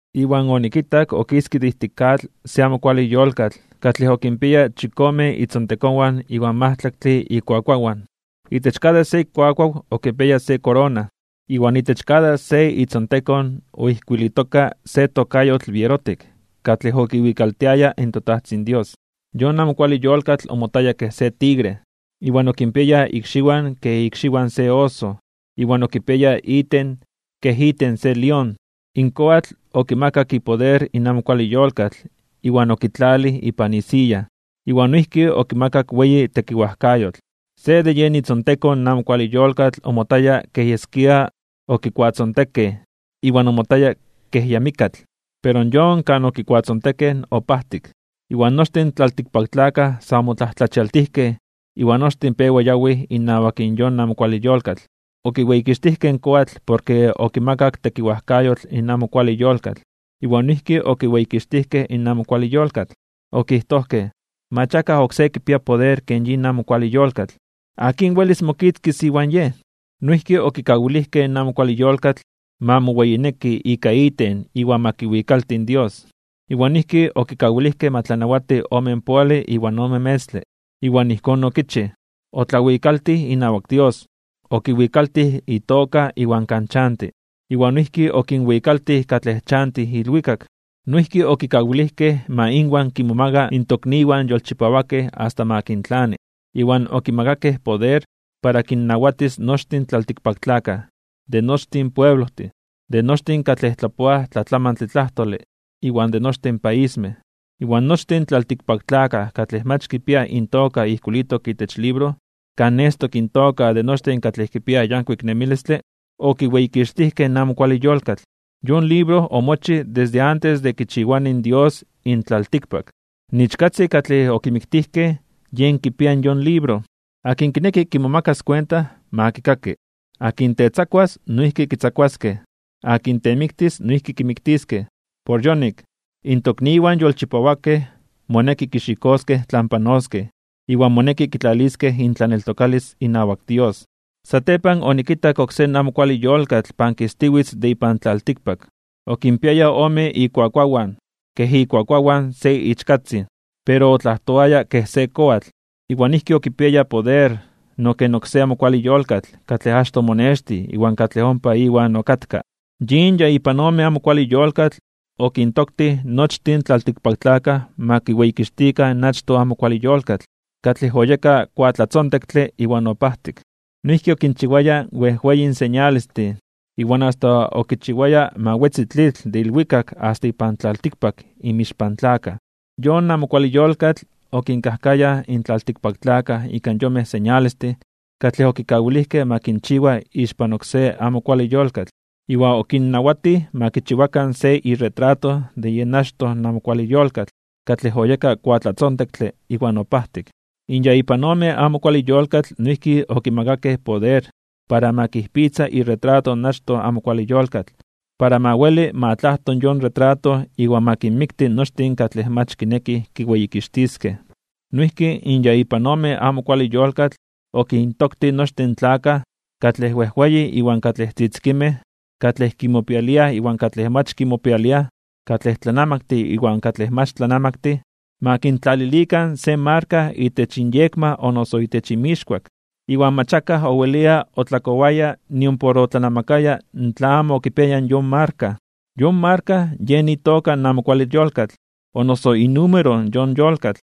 Iwan onikitak okiske de ijtik atl se amo kuale yolkatl katlej okinpiaya chikome itzontekonwan iwan majtlaktle ikuakuawan. Itech kada se ikuakuaw okipiaya se korona, iwan itech kada se itzontekon oijkuilitoka se tokayotl bierotik katlej okiwikaltiaya in toTajtzin Dios. Yon amo kuale yolkatl omotaya kej se tigre, iwan okinpiaya ikxiwan kej ikxiwan se oso, iwan okipiaya iten kej iten se lión. In koatl okimakak ipoder in amo kuale yolkatl iwan okitlalij ipan isiya, iwan noijki okimakak weyi tekiwajkayotl. Se de yen itzontekon in amo kuale yolkatl omotaya kej yeskia okikuatzontekej iwan omotaya kej ya mikkatl. Pero yon kan okikuatzontekej opajtik, iwan nochtin in tlaltikpaktlakaj sa omotlajtlachialtijkej (omomajmawtijkej) iwan nochtin pewa yawij inawak in amo kuale yolkatl. Okiweyikixtijkej in koatl porke okimakak tekiwajkayotl in amo kuale yolkatl, iwan noijki okiweyikixtijkej in amo kuale yolkatl. Okijtojkej: ―Mach akaj oksé kipia poder ken yin amo kuale yolkatl. ¿Akin welis mokitzkis iwan yej? Noijki okikawilijkej in amo kuale yolkatl ma moweyineki ika iten iwan ma kiwikalti in Dios. Iwan noijki okikawilijkej ma tlanawati omenpoale iwan ome metztle. Iwan ijkón okichij. Otlawikaltij inawak Dios, okiwikaltij itoka iwan kan chanti, iwan noijki okinwikaltij katlej chantij ilwikak. Noijki okikawilijkej ma inwan kimomaga in tokniwan yolchipawakej asta ma kintlani. Iwan okimakakej poder para kinnawatis nochtin in tlaltikpaktlakaj, de nochtin pueblojtin, de nochtin katlej tlapoaj tlatlamantle tlajtole, iwan de nochtin paismej. Iwan nochtin in tlaltikpaktlakaj katlej mach kipiaj intoka ijkuilitok itech libro, kan nestok intoka de nochtin katlej kipiaj yankuik nemilistle, okiweyikixtijkej in amo kuale yolkatl. Yon libro omochij desde antes de kichiwani in Dios in tlaltikpak. In Ichkatzin katlej okimiktijkej, yen kipia in yon libro. Akin kineki kimomakas kuenta, ma kikaki. Akin tetzakuas, noijki kitzakuaskej. Akin temiktis, noijki kimiktiskej. Por yonik, in tokniwan yolchipawakej moneki kixikoskej tlan panoskej, iwan moneki kitlaliskej intlaneltokalis inawak Dios. Satepan onikitak oksé amo kuale yolkatl, pankistiwitz de ipan tlaltikpak. Okinpiaya ome ikuakuawan kej ikuakuawan se ichkatzin, pero otlajtoaya kej se koatl. Iwan noijki okipiaya poder no ken oksé amo kuale yolkatl katlej achtoj omonextij iwan katlej ompa iwan okatka. Yin ya ipan ome amo kuale yolkatl okintoktij nochtin in tlaltikpaktlakaj ma kiweyikixtikan in achtoj amo kuale yolkatl, katlej oyeka kuatlatzontektle iwan opajtik. Noijki okinchiwaya wejweyin señalestin, iwan asta okichiwaya ma wetzi tlitl de ilwikak asta ipan tlaltikpak inmixpan tlakaj. Yon amo kuale yolkatl okinkajkayaj in tlaltikpaktlakaj ika yonmej señalestin katlej okikawilijkej ma kinchiwa ixpan oksé amo kuale yolkatl. Iwan okinnawatij ma kichiwakan se iretrato de yen achtoj amo kuale yolkatl, katlej oyeka kuatlatzontektle iwan opajtik. In ya ipan ome amo kuale yolkatl noijki okimakakej poder para ma kijpitza iretrato in achtoj amo kuale yolkatl, para ma weli ma tlajto yon retrato iwan ma kinmikti nochtin katlej mach kinekij kiweyikixtiskej. Noijki in ya ipan ome amo kuale yolkatl okintoktij nochtin in tlakaj, katlej wejweyin iwan katlej tzitzikinmej, katlej kimopialiaj iwan katlej mach kimopialiaj, katlej tlanamaktin iwan katlej mach tlanamaktin, ma kintlalilikan se marka itech inyekma o noso itech inmixkuak. Iwan mach akaj owelia otlakowaya nimpor otlanamakaya tla amo okipiaya yon marka. Yon marka yen itoka in amo kuale yolkatl o noso inúmero yon yolkatl.